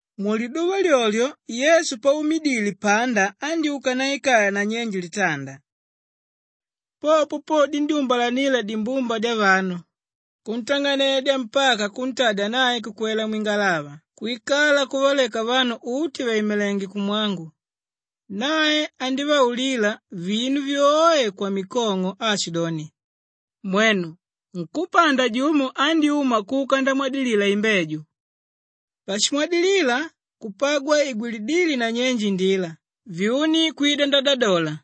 Muliduva lyolyo Yesu paumidile panda andyúka ndaikala nanyenje litanda. Popo po dindyúmbalanila dimbumba dyavanu, kuntang'anedya mpaka kuntadya nae kukwela mwingalava kwikala kuvaleka vanu uti vàimidile kumwangu. Nae andívaulila vinu vyoe kwamikong'o aashidoni, “Mwenu! Nkúpanda jumo andyúma kuka ndamwadilila imbeju. Pashimwadilila kupagwa igwilidíle nanyenje indila vyuni kwida ndadadola.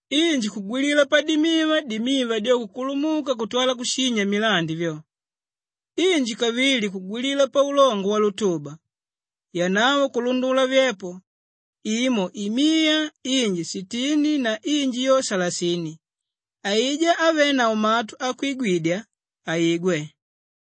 Inji kugwilila padimiva, dimiva dyo kukulumuka kutwala kushinya milandi vyo. Inji kavili kugwilila paulongo walutuba, yanavo kulundula vyepo; imo imiya, inji sitini na inji yo salasini. Aijá ávenavo matu akwigwidya, aigwe.”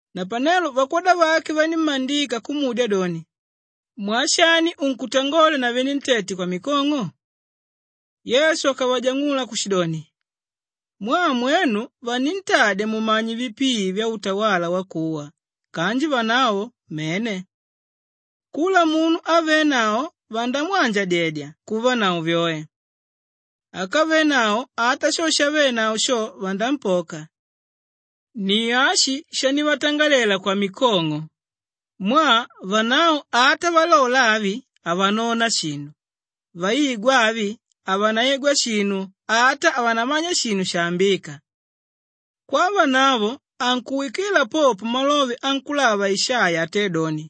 Napanelo vakwoda vake vanímmandika kumudya doni, “Mwaa shani unkutangola na venentete kwamikong'o?” Yesu akavajang'ula kushidoni, “Mwaa mwenu vanintadya mumanye vipii vyautawala wakuwa kanji vanavo mene. Kula munu ávenavo vandamwanjadyedya kuvanavo vyoe. Ákavenavo ata sho shavenavo sho, vanampoka. Ni ashi shandivatangalela kwamikong'o mwaa, “ ‘Vanavo ata valola avi, havanona shinu, vaigwa avi, havanaigwa shinu ata havanamanya shinu shaambíka.’ Kwavanavo ankuwikila popo malove ankulava Ishaiya atédoni,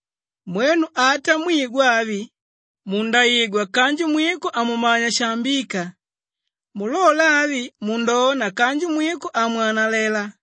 “ ‘Mwenu ata mwigwa avi, mundaigwa kanji mwiko hamumanya shaambíka, mulola avi, mundona kanji mwiko hamwanalela.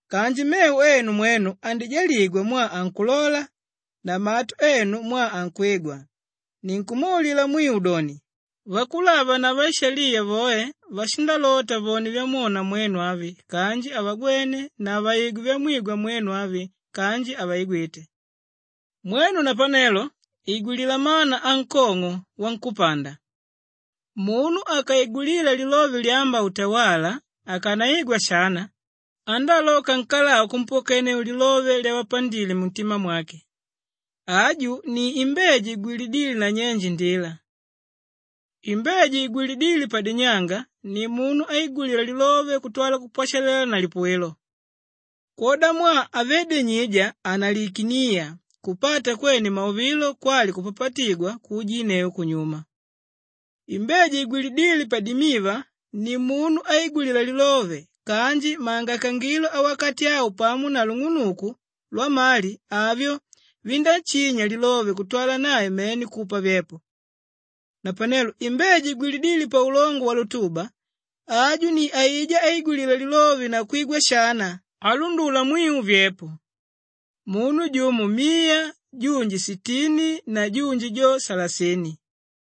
“Kanji mevo enu mwenu andijaligwa mwaa ankulola na matu enu mwaa ankwigwa. Ninkumwaulila mwiu doni, vakulava na vaishaliya voe vashindalota vone vyamwona mwenu avi kanji havagwene na vaigwe vyamwigwa mwenu avi kanji havaigwite. “Mwenu napanelo igwilila mana ankong'o wankúpanda. Munu akaigwilila lilove lyámba utawala, akanaigwa shana, andáaloka nkalau kumpokenneu lilove lyavapandile muntima mwake. Aju ni imbeju igwilidíle nanyenje indila. Imbeju igwilidíle padinyanga ni munu áigwilila lilove kutwala kupwashalela na lipuwilo. Kwodamwaa havé dinyija, hanalikiniya. Kupata kwene mauvilo kwali kupapatigwa, kuujinneu kunyuma. Imbeju igwilidíle padimiva ni munu áigwilila lilove kanji mangaikangilo awakati au pamo na lung'unuku lwamali, avyo vindáshinya lilove kutwala nae mene kupa vyepo. Napanelo imbeju igwilidíle paulongo walutuba, aju ni aijá áigwilila lilove na kwigwa shana, álundula mwiu vyepo; munu jumo miya, junji sitini na junji jo salasini.”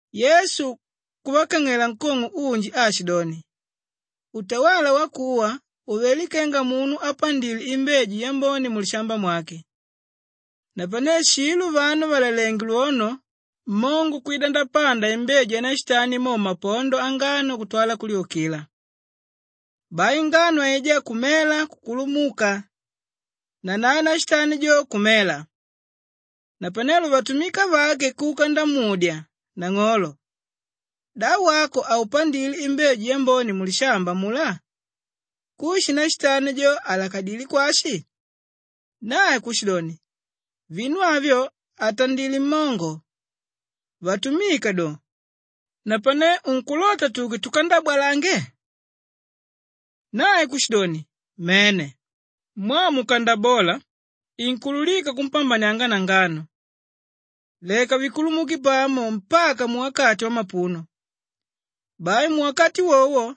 Yesu kuvakang'ela nkong'o unji aashidoni, “Utawala wakuwa uvelé kenga munu ápandile imbeju yambone mulishamba mwake. Napane shilo vanu vàlalenge lwono, mmongo kwida ndapanda imbeju yanashitani mo mmapondo angano kutwala kulyukila. Bai ngano aijá kumela kukulumuka, nanae nashitani jo kumela. Napanelo vatumika vake kuka ndamudya, ‘Nang'olo, da wako haupandile imbeju yambone mulishamba amulá? Kushi nashitani jo, aalakadilé kwashi?’ Nae kushidoni, ‘Vinu avyo atandilé mmongo.’ Vatumika do, ‘Napane unkulota tuke tukandabwalange?’ Nae kushidoni, ‘Mene! Mwaa mukandabola inkuulukika kumpambanianga na ngano. Leka vikulumuke pamo mpaka muwakati wamapuno. Bai muwakati wowo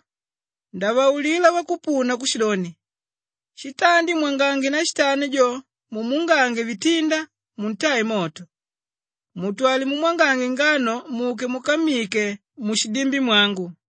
ndavaulila vakupuna kushidoni, shitandi mwangange nashitani jo mumuungange vitinda muntae moto, mutwale mumwangange ngano muke mukammike mushidimbi mwangu.’”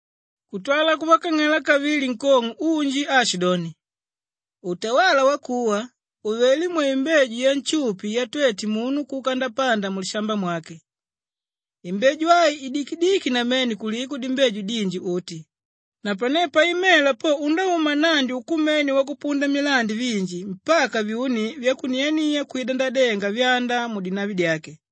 Kutwala kuvakang'ela kavili nkong'o unji aashidoni, “Utawala wakuwa uvelé mwaimbeju yanshupi yatwete munu kuka ndapanda mulishamba mwake. Imbeju ai idikidiki namene kuliko dimbeju dinji uti, napane paimela po undáuma nnandi ukumene wakupunda milandi vinji mpaka vyuni vyakuniania kwida ndadenga vyanda mudinavi dyake.”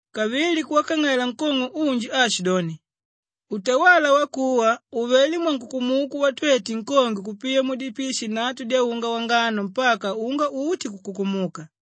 Kavili kuvakang'ela nkong'o unji aashidoni, “Utawala wakuwa uvelé mwankukumuku watwete nkongwe kupiya mudipishi nnatu dyaunga wangano mpaka unga uti kukumuka.”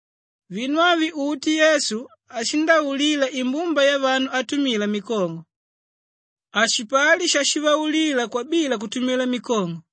Vinu avi uti Yesu ashindaulila imbumba yavanu atumila mikong'o. Hashipali shashivaulila kwabila kutumila mikong'o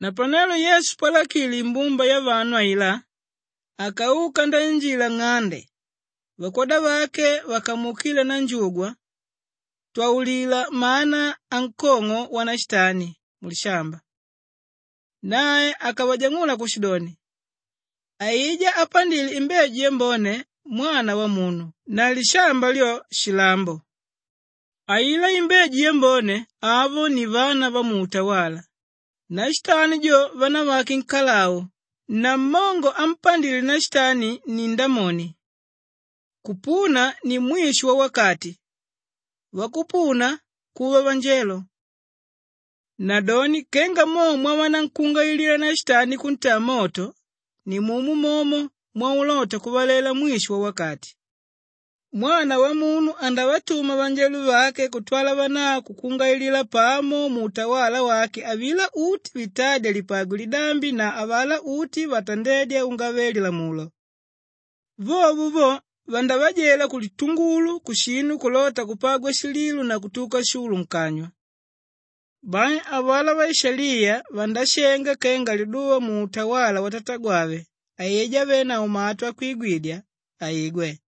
Napanelo Yesu palakile imbumba yavanu ailá, akauka ndainjila nng'ande. Vakwoda vake vakamuukila ndanjugwa, “Twaulila mana ankong'o wanashitani mulishamba.” Nae akavajang'ula kushidoni, “Aijá ápandile imbeju yambone, Mwana Wamunu na lishamba lyo, shilambo. Ailá imbeju yambone, avo ni vana vamuutawala, nashitani jo vanavake nkalau na mmongo ámpandile nashitani ni Ndamoni. Kupuna ni mwisho wawakati, vakupuna kuva vanjelo. Nadoni kenga mo mwavanankungailila nashitani kuntaa moto, nimomo mwaulota kuvalela mwisho wawakati. Mwana Wamunu andavatuma vanjelo vake kutwala vanavo kukungailila pamo muutawala wake avilá uti vitádya lipagwe lidambi na avalá uti vatandédya ungave-lilamulo. Vovo vo, vandavajela kulitungulu, kushinu kulota kupagwa shililo na kutuka shulu nkanywa. Bai avalá vaishaliya vandashenga kenga liduva muutawala watatagwave. Aijá ávenavo matu akwigwidya, aigwe.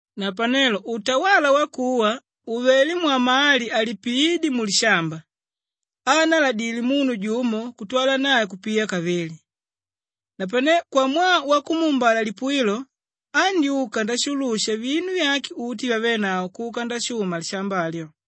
“Napanelo utawala wakuwa uvelé mwamali alipiídye mulishamba, aanaladíle munu jumo kutwala nae kupiya kavili. Napane kwamwaa wakumuumbala lipuwilo, andyúka nashulusha vinu vyake uti vyavénavo kuka ndashuma lishamba alyo.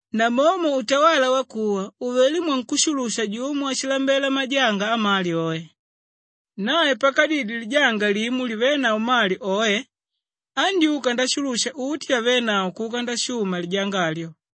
“Namomo utawala wakuwa uvelé mwankushulusha jumo áshilambela majanga amali oe. Nae pakadidye lijanga limo livénavo mali oe andyúka ndashulusha uti vyavénavo kuka ndashuma lijanga alyo.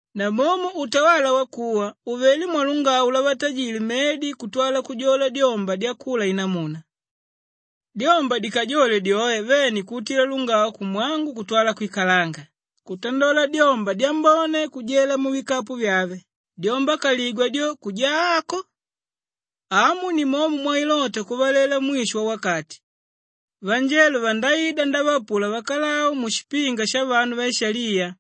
“Namomo utawala wakuwa uvelé mwalungau lwavatajile mmedi kutwala kujola dyomba dyakula namuna. Dyomba dikajole dyoe vene kuutidya lungau kumwangu kutwala kwikalanga, kutandola dyomba dyambone kujela muvikapu vyave dyomba kaligwa dyo, kujaa ako. Amu nimomo mwailota kuvalela mwisho wawakati; vanjelo vandaida ndavaapula vakalau mushipinga shavanu vaishaliya.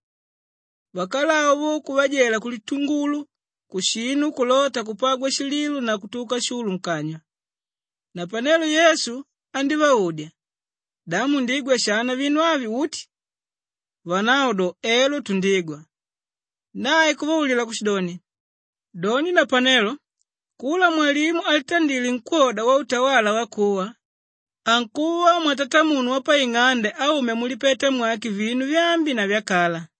Vakalau vo kuvajela kulitungulu kushinu kulota kupagwa shililo na kutuka shulu nkanywa.” Napanelo Yesu andívaudya, “Da mundigwa shana vinu avi uti?” Vanavo do, “Elo tundigwa.” Nae kuvaulila kushidoni, “Doni napanelo kula mwalimu álitandile nkwóda wautawala wakuwa ankuva mwatatamunu wapaing'ande áumya mulipeta mwake vinu vyaambi na vyakala.”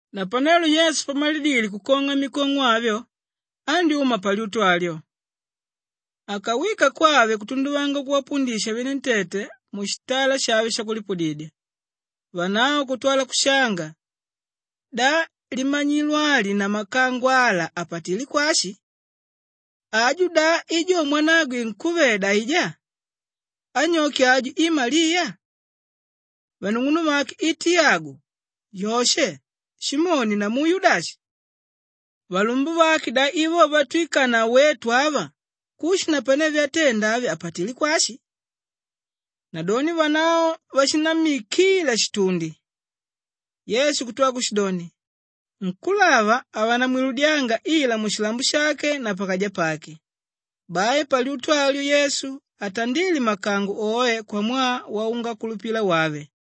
Napanelo Yesu pamalidile kukong'a mikong'o avyo andyúma palyutu alyo. Akawika kwave kutunduvanga kuvapundisha venentete mushitala shave shakulipudidya. Vanavo kutwala kushanga, “Da limanyilo ali na makango ala apatilé kwashi? Aju da i jo mwanagwe nkúveda aijá? Anyoke aju i Maliya? Vanung'unuvake i Tiyagu, Yoshe, Simoni, namu Yudashi? Valumbuvake da i vo vatwikanavo wetu ava? Kushi napane vyatenda avi apatilé kwashi?” Nadoni vanavo vashinammikila shitundi. Yesu kutwala kushidoni, “Nkúlava havanamwiludyanga ila mushilambo shake na pakaja pake.” Bai palyutu alyo, Yesu hatandíle makango oe kwamwaa waungakulupila wave.